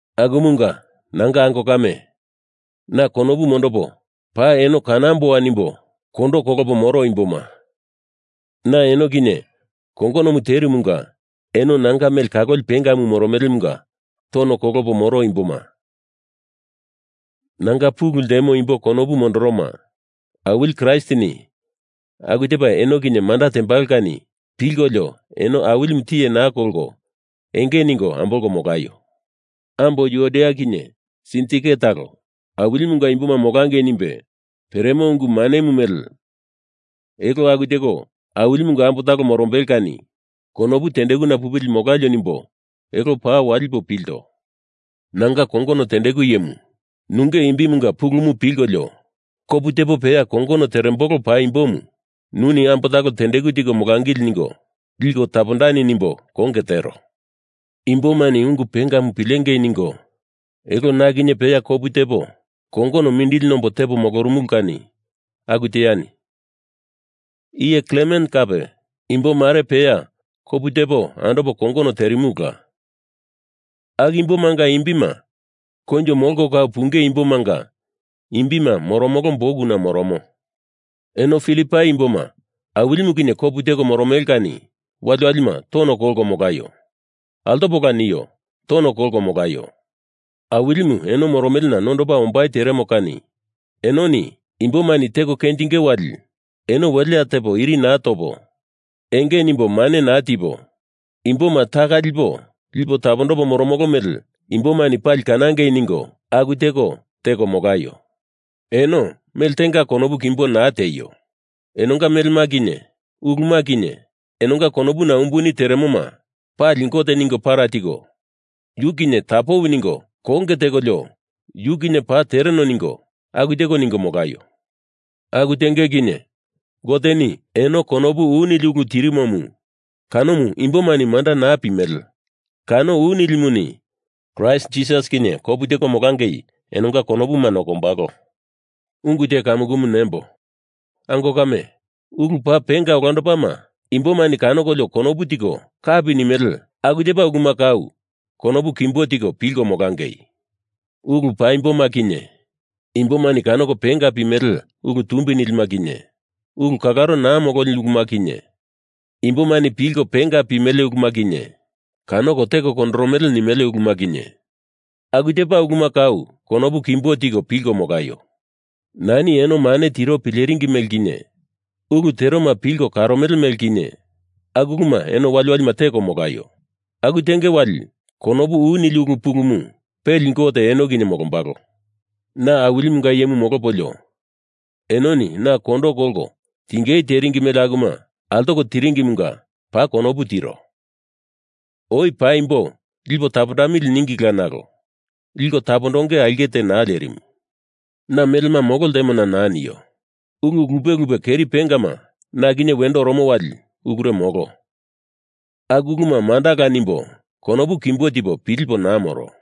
Akumunga, nanga ango kame, na konopu mondopo paa eno kanamboa nimbo kondo kolopo moro imboma, na eno kinye kongonomu terumunga eno nanga mele kaloli pengamu moromelemunga tono kolopo moro imboma, nanga pulu ltemo imbo konopu mondoroma, Awili Kraistini aku tepa eno kinye manda tembalo kani pilkolio eno Awilimu tiye naa kolko enge ningo ambolko molaio. Ambo Yuodia kinye Sintike talo, Awilimunga imboma molangei nimbe peremo ungu manemu mele elo aku teko Awilimunga ambo talo morombele kani konopu tendekuna pupili molalio nimbo elo paa walipo pilto. Nanga kongono tendeku iyemu, nunge imbimunga pulumu pilkolio kopu tepo peya kongono terembolo paimbomu nuni ambo talo tendeku tiko molangili ningo liko tapondani nimbo konge tero. Imbomani ungu pengamu pilengei ningo elo na kinye peya kopu tepo kongono mindili nombo tepo molorumulu kani aku teani. Iye Klemen kape imbo mare peya kopu tepo andopo kongono terimulula, aku imbomanga imbima koinjo molko kau punge imbomanga imbima moromolo bukuna moromo. Eno Filipai imboma, Awilimu kinye kopu teko moromele kani waliwalima tono kolko molaio. Altopola nio. Tono kolko molaio. Awilimu eno moromelena nondopa ombai teremo kani enoni imbomani teko kenjinge wali eno welea tepo iri topo enge nimbo mane naa tipo, imboma taka lipo lipo tapondopo moromolo mele imbomani pali kanangei ningo aku teko teko molaio. Eno mele tenga konopu kimbo naa tieio. Enonga melema kinye uluma kinye enonga konopuna umbuni teremoma pali Gote ningo para tiko, yu kinye tapoi ningo konge tekolio yu kinye paa tereno ningo, aku teko ningo molaio. Aku tenge kinye Goteni eno konopu u nili ulu tirimomu, kanomu imbomani manda naa pimele, kano u nilimuni Kraist Jisas kinye kopu teko molangei enonga konopuma nokombalo. Ungu te kamukumu nembo. Ango kame, ulu paa penga olandopama, imbomani kanokolio konopu tiko kapi nimele aku tepa uluma kau konopu kimbo tiko pilko molangei. Ulu paimboma kinye, imbomani kanoko penga pimele ulu tumbi nilima kinye, ulu kalaro naa mololi uluma kinye, imbomani pilko penga pimele uluma kinye, kanoko teko kondorono nimele uluma kinye, aku tepa uluma kau konopu kimbo tiko pilko molaio. Nani eno mane tiro pileringi mele kinye, ulu teroma pilko karomele mele kinye, aku uluma eno waliwalima teko molaio. Aku tenge wali konopu u nili ulu pulumu peli Gote eno kinye molombalo. Na Awilimunga iyemu molopolio enoni na kondo kolko tingei teringi mele akuma altoko teringimunga paa konopu tiro. Oi paimbo lipo tapondamili ningila nalo liko tapondongei aulke te naa lerimu. Na melema molo ltemona naa nio. Ulu lupe lupe keri pengama na kinye wendo oromo wali ulure molo, aku uluma mandala nimbo konopu kimbo tipo pilipo naa moro.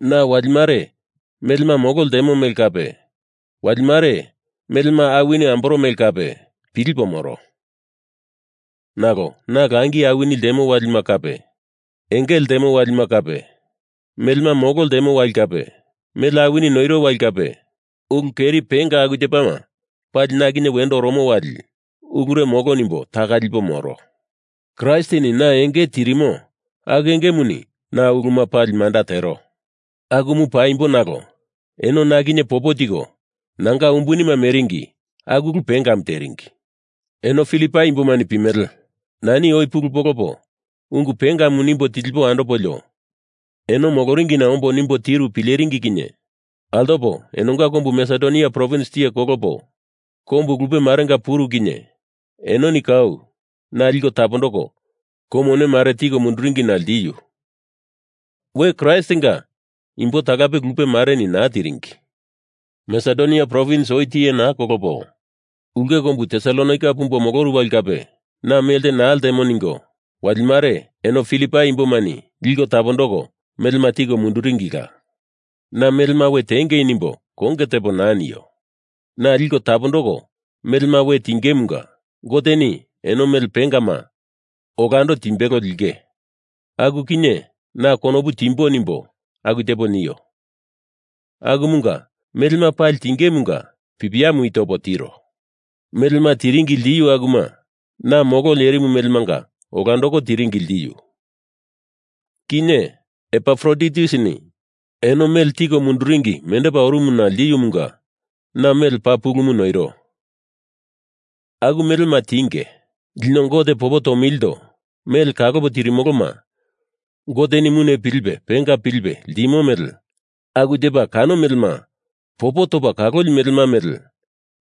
Na wali mare melema molo ltemo mele kape, wali mare melema awini amboro mele kape pilipo moro. Nalo na langi awini ltemo walima kape engele ltemo walima kape, melema molo ltemo wali kape mele awini noiro wali kape, ulu keri penga aku tepama pali na kinye wendo oromo wali ulure molo nimbo taka lipo moro. Kraistini na enge tirimo aku engemuni na uluma pali manda tero. Akumu paimbo nalo eno na kinye popo tiko nanga umbunima meringi aku ulu pengamu teringi. Eno Filipai imbomani pimele, nani oi pulu polopo ungu pengamu nimbo tilipo andopolio eno moloringina ombo nimbo tiru pileringi kinye altopo enonga kombu Masedonia provins tiye kolopo kombu lupe marenga puru kinye enoni kau na liko tapondoko kou mone mare tiko munduringina ltiu. We Kraistinga imbo talape lupe mareni naa tiringi. Masedonia provins oi tiye naa kolopo ulke kombu Tesalonaika pumbo moloru wali kape na melte naa ltemo ningo wali mare eno Filipai imbomani liko tapondoko melema tiko munduringila. Na melema we tiengei nimbo konge tepo naa nio. Na liko tapondoko melema we tingemunga Goteni eno mele pengama olando timbelo linge, aku kinye na konopu timbo nimbo aku tepo nio Akumunga melema pali tingemunga pipiamu i topo tiro. Melema tiringi ltiu akuma na molo lerimu melemanga olandoko tiringi ltiu. Kinye Epafroditusini eno mele tiko munduringi mendepa orumuna ltiumunga na mele paa pulumu noiro. Aku melema tinge, lino Gote popo tomilindo mele kalopo tirimoloma Goteni mune pilipe penga pilipe limo mele aku tepa kano melema popo topa kaloli melema mele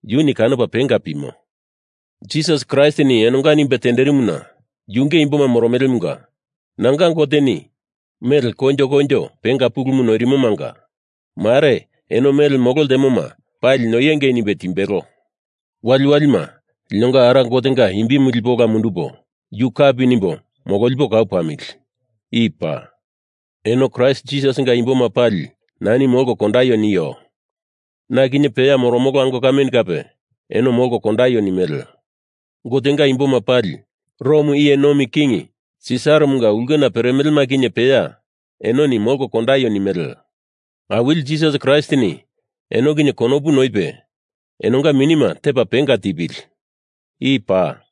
yuni kanopa penga pimo. Kraist Jisasini enonga nimbe tenderimuna yunge imboma moromelemunga, nanga Goteni mele koinjo koinjo penga pulumu noirimomanga mare eno mele molo ltemoma pali noiengei nimbe timbelo. Waliwalima linonga Ara Gotenga imbi lipo ola mundupo yu kapi nimbo mololipo kau pamili. I paa. Eno Kraist Jisasinga imboma pali nani molko kondaio nio. Na kinye peya moromolo ango kameni kape eno molko kondaio nimele. Gotenga imboma pali, Rom iye nomi king Sisaramunga ulkena peremelema kinye peya, enoni molko kondaio nimele. Awili Jisas Kraistini eno kinye konopu noipe enonga minima tepa penga tepili. I paa.